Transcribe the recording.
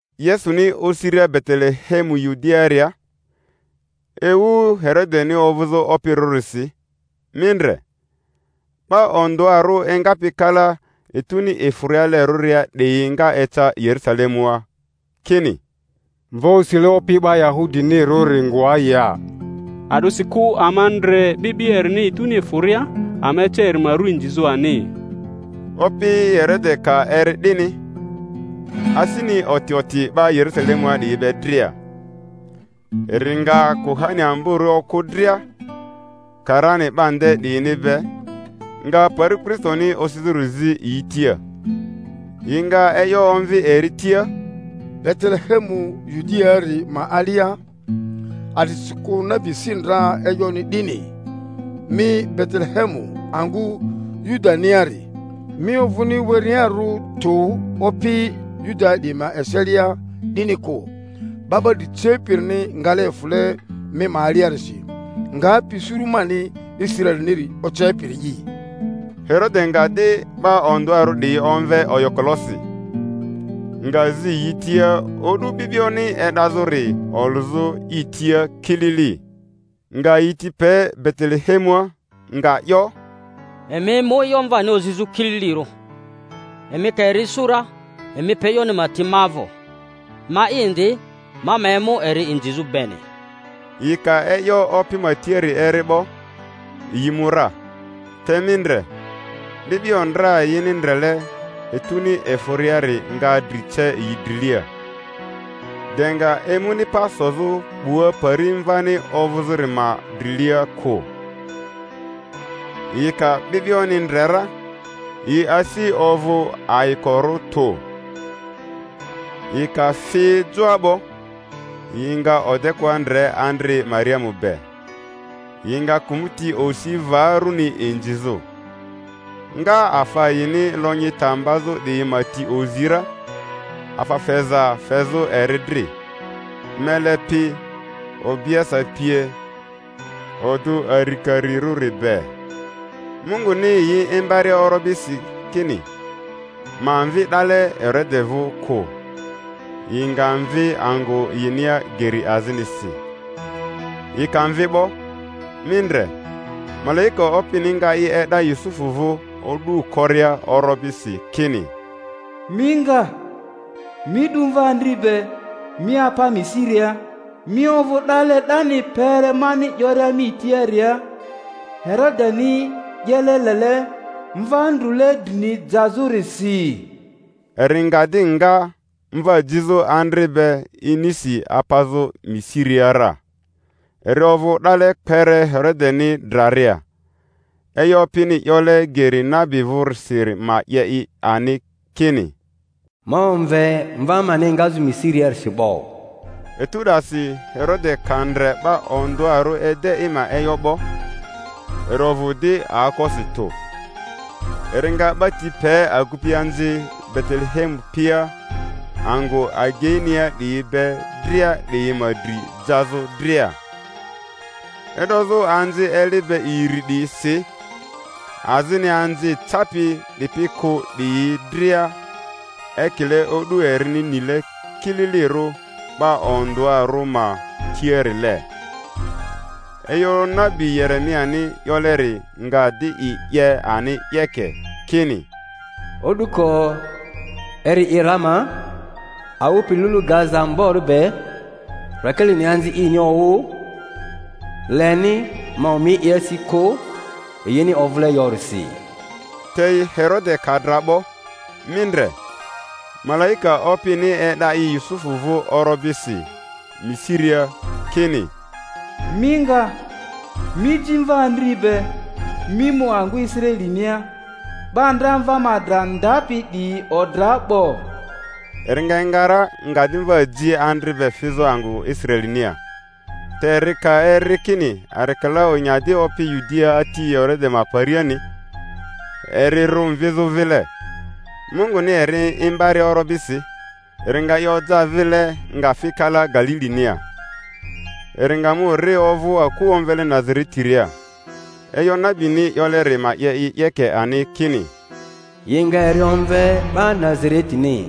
Yesuni osiria Betelehemu Yudiaaria ewu Herodeni ovᴜzᴜ opirᴜrisi, mi ndre, 'ba ondᴜarᴜ engapi kala etuni efᴜrialerᴜria 'diyi nga eca Yerusalemua, kini, Mva osile opi 'ba Yahudinirᴜri ngoa ya? A'disikᴜ ama ndre 'bi'bio erini etuni efᴜria, ama eca eri ma ru inzizᴜ ani. Opi Herode ka eri 'dini, asini oti oti, 'ba Yerusalemua 'diyi be dria; eri nga kuhani amborᴜ okᴜ dria, karani 'ba nde 'diyini be, nga pari Kristoni osizᴜri zi yi tia. Yi nga e'yo omvi eri tia, Betelehemu Yudiaari ma alia; a'disikᴜ nabi si ndra e'yoni 'dini: Mi Betelehemu angᴜ Yudaniari, mi ovᴜni werearᴜ tu opi Yudaa 'diyi ma eselia, 'dini kᴜ; 'ba 'ba dri cepirini ngale efᴜle mi ma aliarisi, ngapi suru mani Israeliniri ocepiri'i. Herode nga di 'ba ondᴜarᴜ 'diyi omve oyokolosi, nga zi yi tia o'du 'bi'bioni e'dazᴜri olᴜzᴜ i tia kilili; nga yi ti pe Betelehemua, nga 'yo, Emi mu e'yo mvani ozi kililirᴜ, emi ka eri isu ra emi pe e'yoni ma ti ma vᴜ, ma'i indi ma ma emu eri inzizᴜ beni. Yi ka e'yo opi ma tiari eri 'bo, yi mu ra; te mi ndre, 'bi'bio ndra yini ndrele etuni efᴜriari nga dri ce yi drilia, de nga emuni pa sozᴜ 'bua pari mvani ovᴜzᴜri ma drilia kᴜ. Yi ka 'bi'bioni ndre ra, yi asi ovᴜ ayikorᴜ tᴜ; yi ka fi joa 'bo yi nga odekᴜa ndre andri Mariamu be, yi nga kᴜmᴜti osi va runi inzizᴜ; nga afa yini lonyi ta mbazᴜ 'diyi ma ti ozi ra, afa feza fezᴜ eri dri, mele pi, obiese pie, odᴜ arikarirᴜri be. Munguni yi imbaria orobisi kini ma mvi 'dale Herode vᴜ kᴜ, yi nga mvi angᴜ yinia geri azinisi. Yi ka mvi 'bo, mi ndre, malaika Opini nga i e'da Yusufu vᴜ o'du koria orobisi, kini, Mi nga, mi 'du mva andri be, mi apa Misiria, mi ovᴜ 'dale 'dani kpere mani 'yoria mi tiaria; Herodeni 'yele lele mva ndrule drini jazᴜrisi. Eri nga di nga, mva jizᴜ andri be inisi, apazᴜ Misiria ra; eri ovᴜ 'dale kpere Herodeni draria; e'yo Opini 'yole geri nabi vᴜrisiri ma 'ye i ani, kini, Ma omve mva mani engazᴜ Misiriarisi 'bo. Etu 'dasi Herode ka ndre 'ba ondᴜarᴜ ede i ma e'yo 'bo, eri ovᴜ di aokosi tᴜ, eri nga 'ba ti pe agupianzi Betelehemu pia angᴜ ageinia 'diyi be dria 'diyi ma dri jazᴜ dria, e'dozᴜ anzi eli be iri 'diyisi, azini anzi capi 'dipi kᴜ 'diyi dria, ekile o'du erini nile kililirᴜ 'ba ondᴜarᴜ ma tiarile. E'yo nabi Yeremiani 'yoleri nga di i 'ye ani 'yeke, kini: O'duko eri i Ramaa, awᴜ pi lulu gaza ambori be, Rakelini anzi ini owᴜ; leni ma omi i asi kᴜ, yini ovᴜle yorisi. Te Herode ka dra 'bo, mi ndre, malaika Opini e'da i Yusufu vᴜ orobisi Misiria, kini, Mi nga, mi ji mva andri be, mi mu angᴜ Israelinia; 'ba ndra mva ma dra ndapi 'diyi odra 'bo. Eri nga enga ra, nga di mva ji andri be fizᴜ angᴜ Israelinia. Te eri ka eri kini Arikelao nya di opi Yudiaa ati Herode ma pariani, eri rᴜ mvizᴜ vile; Munguni eri imbaria orobisi, eri nga i oja vile, nga fi kala Galilinia. Eri nga mu ri ovᴜ aku omvele Nazaretiria; e'yo nabini 'yoleri ma 'ye i 'yeke ani, kini, Yi nga eri omve 'ba Nazaretini.